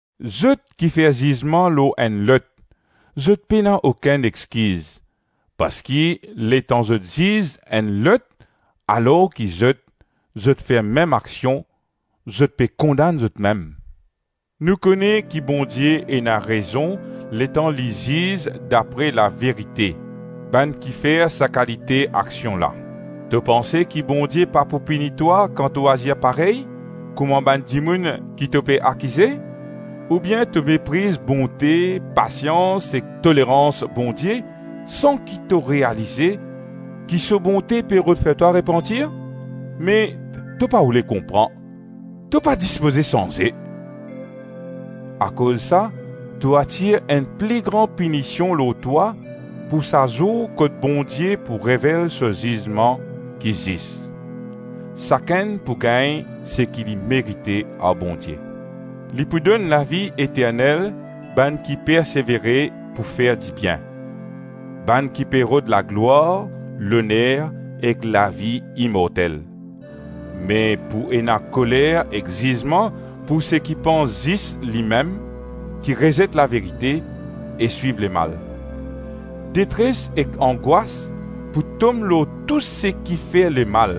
Zot ki fer zizman lor enn lot, zot pena okenn exkiz, parski letan zot ziz enn lot alor ki zot, zot fer mem aksion, zot pe kondann zotmem. Nou kone ki Bondie ena rezon letan li ziz dapre laverite bann ki fer sa bann kalite aksion la. To panse ki Bondie pa pou pini twa kan to azir parey kouma bann dimoun ki to pe akize? Oubien to mepriz bonte, pasians ek tolerans Bondie, san ki to realize ki so bonte pe rod fer twa repantir? Me to pa oule konpran, to pa dispoze sanze. Akoz sa to atir enn pli gran pinision lor twa pou sa zour kot Bondie pou revel so zizman ki zis. Sakenn pou gagn seki li merite ar Bondie. Li pou donn lavi eternel bann ki persevere pou fer dibien, bann ki pe rod laglwar, loner ek lavi imortel. Me pou ena koler ek zizman pou seki pans zis limem, ki rezet laverite e swiv lemal. Detres ek angwas pou tom lor tou seki fer lemal,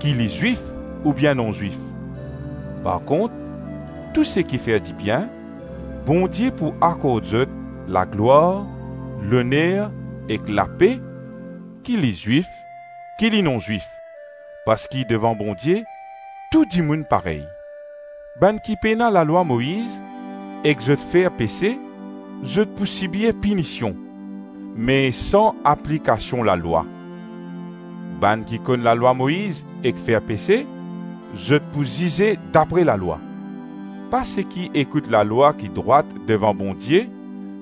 ki li Zwif oubien non-Zwif. Parkont, tou seki fer dibien, Bondie pou akord zot laglwar, loner ek lape, ki li Zwif ki li non-Zwif, parski devan Bondie tou dimoun parey. Bann ki pena lalwa Moiz ek zot fer pese, zot pou sibir pinision, me san aplikasion lalwa; bann ki konn lalwa Moiz ek fer pese, zot pou zize dapre lalwa. Pa seki ekout lalwa ki drwat devan Bondie,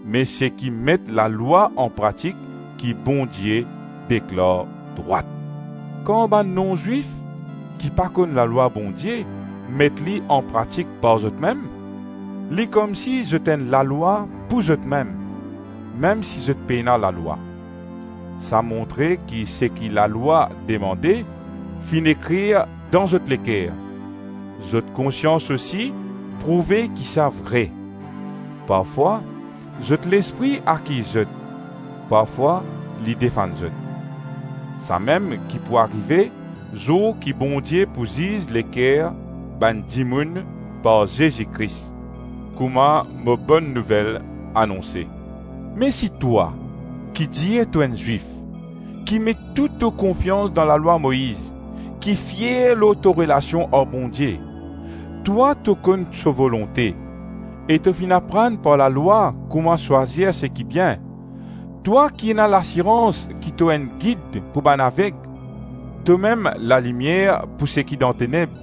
me seki met lalwa anpratik ki Bondie deklar drwat. Kan bann non-Zwif ki pa konn lalwa Bondie met li anpratik par zotmem, li komsi zot enn lalwa pou zotmem, mem si zot pena lalwa. Sa montre ki seki lalwa demande finn ekrir dan zot leker. Zot konsians osi prouve ki sa vre; parfwa zot lespri akiz zot, parfwa li defann zot. Samem ki pou arive zour ki Bondie pou ziz leker bann dimoun par Zezi Kris, kouma mo Bonn Nouvel anonse. Me si twa, ki dir to enn Zwif, ki met tou to konfians dan lalwa Moiz, ki fier lor to relasion ar Bondie, twa, to konn so volonte, e to finn aprann par lalwa kouma swazir seki bien; twa ki ena lasirans ki to enn gid pou bann aveg, tomem lalimier pou seki dan teneb;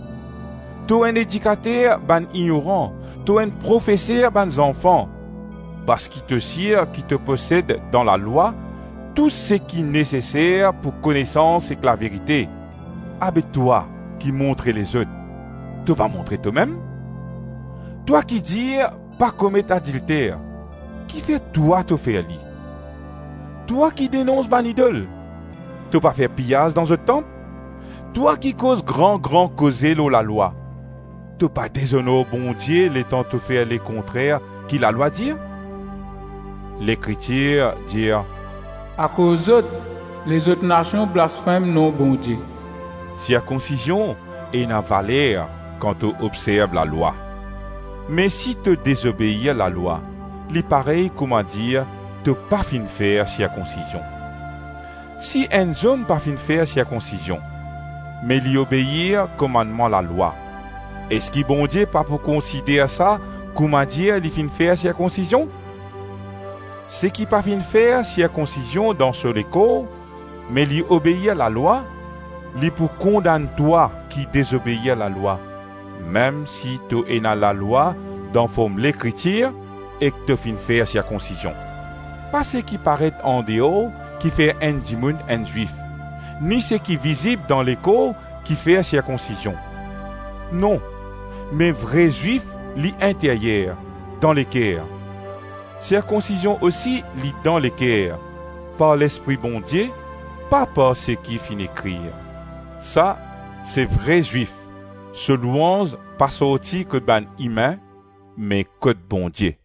to enn edikater bann ignoran, to enn profeser bann zanfan, parski to sir ki to posed dan lalwa tou seki neseser pou konesans ek laverite; abe, twa ki montre lezot, to pa montre tomem? Twa ki dir pa komet adilter, kifer twa to fer li? Twa ki denons bann idol, to pa fer piyaz dan zot tanp? Twa ki koz gran-gran koze lor lalwa, to pa dezonor Bondie letan to fer lekontrer ki lalwa dir? Lekritir dir, “Akoz zot, lezot nasion blasfem nom Bondie.” Sirkonsizion ena valer kan to obzerv lalwa, me si to dezobeir lalwa, li parey koumadir to pa finn fer sirkonsizion. Si enn zom pa finn fer sirkonsizion, me li obeir komannman lalwa, eski Bondie pa pou konsider sa koumadir li finn fer sirkonsizion? Seki pa finn fer sirkonsizion dan so lekor, me li obeir lalwa, li pou kondann twa ki dezobeir lalwa, mem si to ena lalwa dan form Lekritir ek to finn fer sirkonsizion. Pa seki paret andeor ki fer enn dimoun enn Zwif, ni seki vizib dan lekor ki fer sirkonsizion; non, me vre Zwif li interyer, dan leker. Sirkonsizion osi li dan leker, par Lespri Bondie, pa par seki finn ekrir. Sa, se vre Zwif, so louanz pa sorti kot bann imin, me kot Bondie.